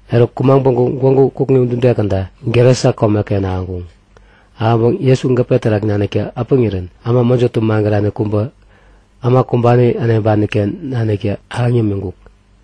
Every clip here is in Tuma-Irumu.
Eruk kumaŋ päŋku gwägu kukŋi udude käda Gerasa komeken ahäŋkuŋ. Ahäŋpäŋ Jesu gäpe terak naniktä äpäŋirän äma mäjotä magärani kubä, äma kumbani äneŋpani-ken naniktä ahäŋ yämiŋkuk.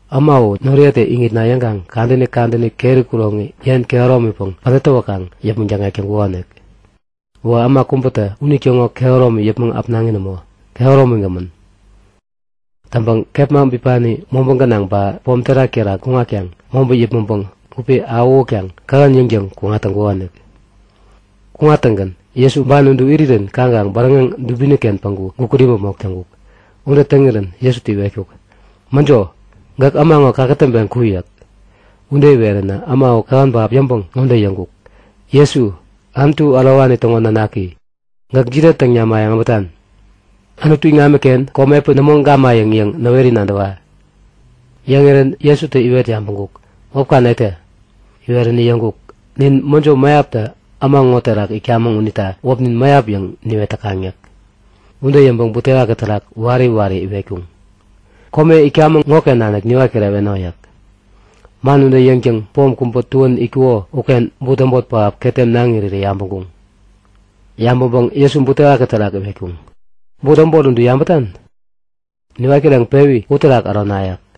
Äma u noriyetä iŋitna yäŋkaŋ kadäni kadäni keri kuroŋi yen kehäromipäŋ pädät täwäkaŋ yäpmäŋ däkŋek täŋkukonik. Uwä äma kubätä unitäŋo kehäromi yäpmäŋ äpnaŋi nämo, kehäromigämän. Täŋpäŋ kepma bipani mobä gänaŋ ba pom terak-terak kuŋatkaŋ mobä yäpmäŋpäŋ gupi awähutkaŋ kähän yäŋtäŋ kuŋat täŋkukonik. Kuŋattäŋgän Jesu ban udu irirän kaŋkaŋ bäräŋeŋ dubini-ken päŋku gukut imäpmok täŋkuk. Ude täŋirän Jesutä iwetkuk; Mäjo, gäk äma ŋo kakätäŋpeŋ ku! yäk. Ude iweränä äma u kähän pähap yäŋpäŋ ŋode yäŋkuk; Jesu, Anutu Ärowani täŋo nanaki, gäk jide täŋ namayäŋ äbätan? Anutu iŋamiken komi epän nämo gamayäŋ yäŋ näweri nadäwa! Yäŋirän Jesutä iwet yabäŋkuk; Wäpka netä? Iweränä yäŋkuk; Nin mäjo mäyaptä äma ŋo terak itkamäŋ unita wäpnin Mäyap yäŋ niwet täkaŋ yäk. Ude yäŋpäŋ butewaki terak wari wari iwetkuŋ; Kome itkamäŋ ŋoken nanik niwat kireweno! yäk. Man ude yäŋtäŋgän pom kubä tuän itkuko uken but äbot pähap ketem naŋ irirä yabäŋkuŋ. Yabäŋpäŋ Jesu butewaki terak iwetkuŋ; But äbot udu yabätan? Niwat kireŋpewi uterak ärona yäk.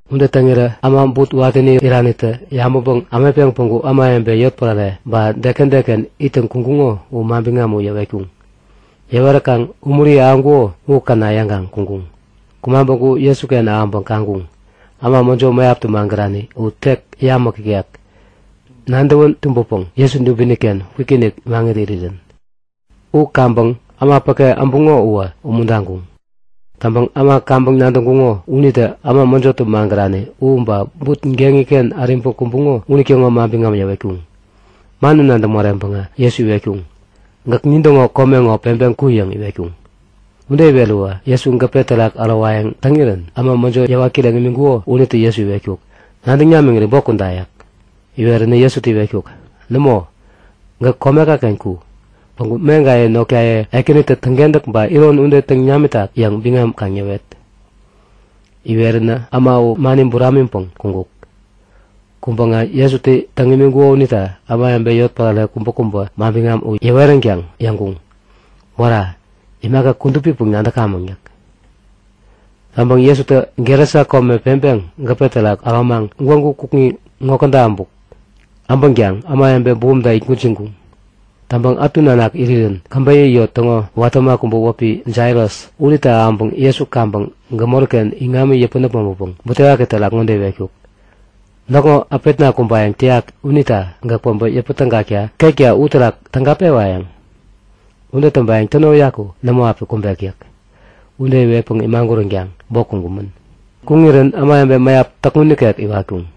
Ude täŋirä äma but watäni iranitä yabäŋpäŋ ämetpeŋ päŋku ämawebe yotpärare ba deken deken ittäŋ kuŋkuŋo u manbiŋam u yäwetkuŋ. Yäweräkaŋ umuri ahäŋkuko u käna yäŋkaŋ kuŋkuŋ. Kumaŋ päŋku Jesuken ahäŋpäŋ kaŋkuŋ. Äma mäjo mäyaptä magärani u tek yamäk ikek, nadäwän tumbäpäŋ Jesu dubini-ken kwikinik maŋit irirän. U kaŋpäŋ äma päke äbuŋo uwä umuntaŋkuŋ. Täŋpäŋ äma kaŋpäŋ nadäŋkuŋo unitä äma mäjotä magärani u ba but geŋi-ken äriŋpäŋ kumbuŋo unitäŋo manbiŋam yäwetkuŋ. Man u nadäŋ moreŋpäŋä Jesu iwetkuŋ; Gäk nintäŋo kome ŋo peŋpeŋ ku! yäŋ iwetkuŋ. Ude iweräwä Jesu gäpe terak ärowayäŋ täŋirän äma mäjo yäwat kireŋ imiŋkuko unitä Jesu iwetkuk; Nadäŋ namiŋiri bok kuda! yäk. Iweränä Jesutä iwetkuk; Nämo! Gäk komeka-ken ku! Päŋku meŋkaye notkaye Ekänitä täŋkentäk ba iron ude täŋ namitak yäŋ biŋam kaŋ yäwet. Iweränä äma u mani buramiŋpäŋ kuŋkuk. Kuŋpäŋä Jesutä täŋ imiŋkuko unita ämawebe yotpärare kubäkubä manbiŋam u yäweränkaŋ yäŋkuŋ; Wära! Imaka kudupipäŋ nadäkamäŋ yäk. Täŋpäŋ Jesutä Gerasa kome peŋpeŋ gäpe terak äromaŋ gwägu kukŋi ŋode käda äbuk. Äbänkaŋ ämawebe bumta itgwäjiŋkuŋ. Täŋpäŋ ätu nanak irirän käbeyä yot täŋo watä äma kubä wäpi Jairas unitä ahäŋpäŋ Jesu kaŋpäŋ gämori-ken iŋami yäpän äpmoŋpäpäŋ butewaki terak ŋode iwetkuk; Näkŋo äpetna kumbayäŋ täyak unita gäk päbä yäpä tägakta ketka uterak täga pewayäŋ? Ude täŋpayäŋ täno uyaku nämo api kumbek yäk. Ude iwetpäŋ imaguränkaŋ bok kuŋkumän. Kuŋirän ämawebe mäyap täkŋun nikek iwatkuŋ.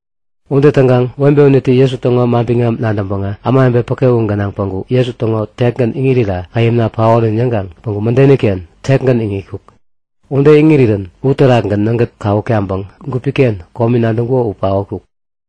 Ude täŋkaŋ webe unitä Jesu täŋo manbiŋam nadäŋpäŋä ämawebe päke u gänaŋ päŋku Jesu täŋo tekgän iŋirira käyämna paorän yäŋkaŋ päŋku mädeni-ken tekgän iŋitkuk. Ude iŋirirän uterakgän nägät kawuk taŋpäŋ gupi-ken komi nadäŋkuko u paotkuk.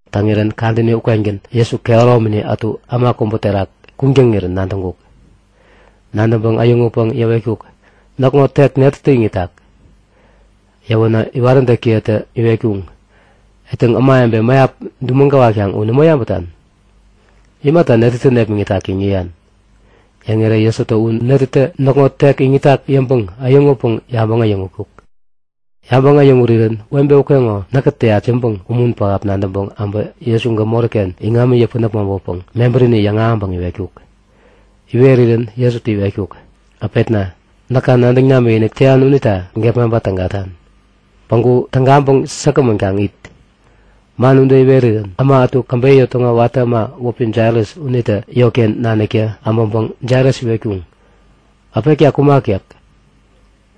Täŋirän kadäni ukengän Jesu kehäromini ätu äma kubä terak kuŋtäŋirän nadäŋkuk. Nadäŋpäŋ äyäŋutpäŋ yäwetkuk; Näkŋo tek netätä iŋitak? Yäwänä iwaräntäkiyetä iwetkuŋ; Etäŋ, ämawebe mäyap dumäŋ gäwatkaŋ u nämo yabätan? Imata netätä nepmäŋitak yäŋ yäyan? Yäŋirä Jesutä u netätä näkŋo tek iŋitak yäŋpäŋ äyäŋutpäŋ yabäŋ äyäŋutkuk. Yabäŋ äyäŋurirän webe ukeŋo Näkä täyat yäŋpäŋ umun pähap nadäŋpäŋ äbä Jesu gämori-ken iŋami yäpän äpmoŋpäpäŋ mebärini yäŋahäŋpäŋ iwetkuk. Iwerirän Jesutä iwetkuk; Äpetna, näka nadäŋ namikinik täyan unita gepmaŋpa tägatan. Päŋku tägaŋpäŋ säkgämän kaŋ it! Man ude iwerirän äma ätu käbeyä yot täŋo watä äma wäpi Jairas unitä yotken naniktä abäŋpäŋ Jairas iwetkuŋ; Äpetka kumak yäk.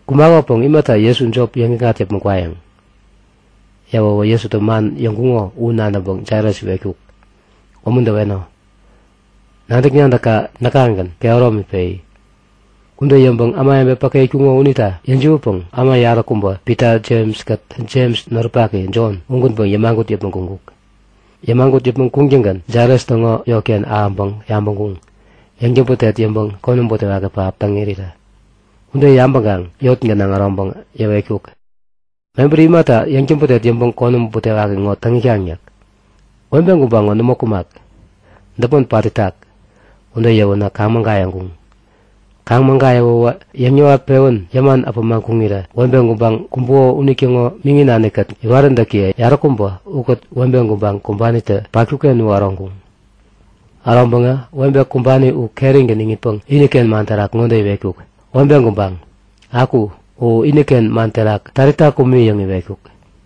Kumakopäŋ imata Jesu jop yäŋikŋat yäpmäŋ kwayäŋ? Yäwäwä Jesutä man yäŋkuŋo u nadäŋpäŋ Jairas iwetkuk; Umuntäweno! Nadäk-nadäkka näkagän kehäromi peyi! Ude yäŋpäŋ ämawebe päke itkuŋo unita yäjiwätpäŋ äma yaräkubä Pita, Jems-kät Jems noripaki Jon ugänpäŋ yämagut yäpmäŋ kuŋkuk. Yämagut yäpmäŋ kuŋtäŋgän Jairas täŋo yotken ahäŋpäŋ yabäŋkuŋ; Yäŋtäbätet yäŋpäŋ konäm butewaki pähap täŋ irirä. Ude yabäŋkaŋ yot gänaŋ äroŋpäŋ yäwetkuk; Mebäri imata yäŋtäbätek yäŋpäŋ konäm butewaki ŋo täŋ itkaŋ yäk? Webe gubaŋ ŋo nämo kumak. Däpmon pat itak. Ude yäwänä kaŋ-mägayäŋkuŋ. Kaŋ-mägayäwäwä yäŋ-yäwat-pewän yäman äpämaŋ kuŋirä webe gubaŋ kumbuko unitäŋo miŋi nani-kät iwaräntäkiye yaräkubä ukät webe gubaŋ kumbanitä patkuk-ken u äroŋkuŋ. Äroŋpäŋä webe kumbani u kerigän iŋitpäŋ iniken man terak ŋode iwetkuk; Webe gubaŋ, aku! (U iniken man terak Talita kumi yäŋ iwetkuk.)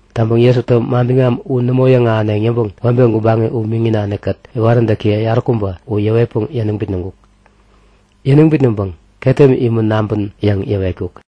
Täŋpäŋ Jesutä manbiŋam u nämo yäŋahäneŋ yäŋpäŋ webe gubaŋi u miŋi nani-kät iwaräntäkiye yaräkubä u yäwetpäŋ yäniŋ bitnäŋkuk. Yäniŋ bitnäŋpäŋ ketem imä naŋpän yäŋ yäwetkuk.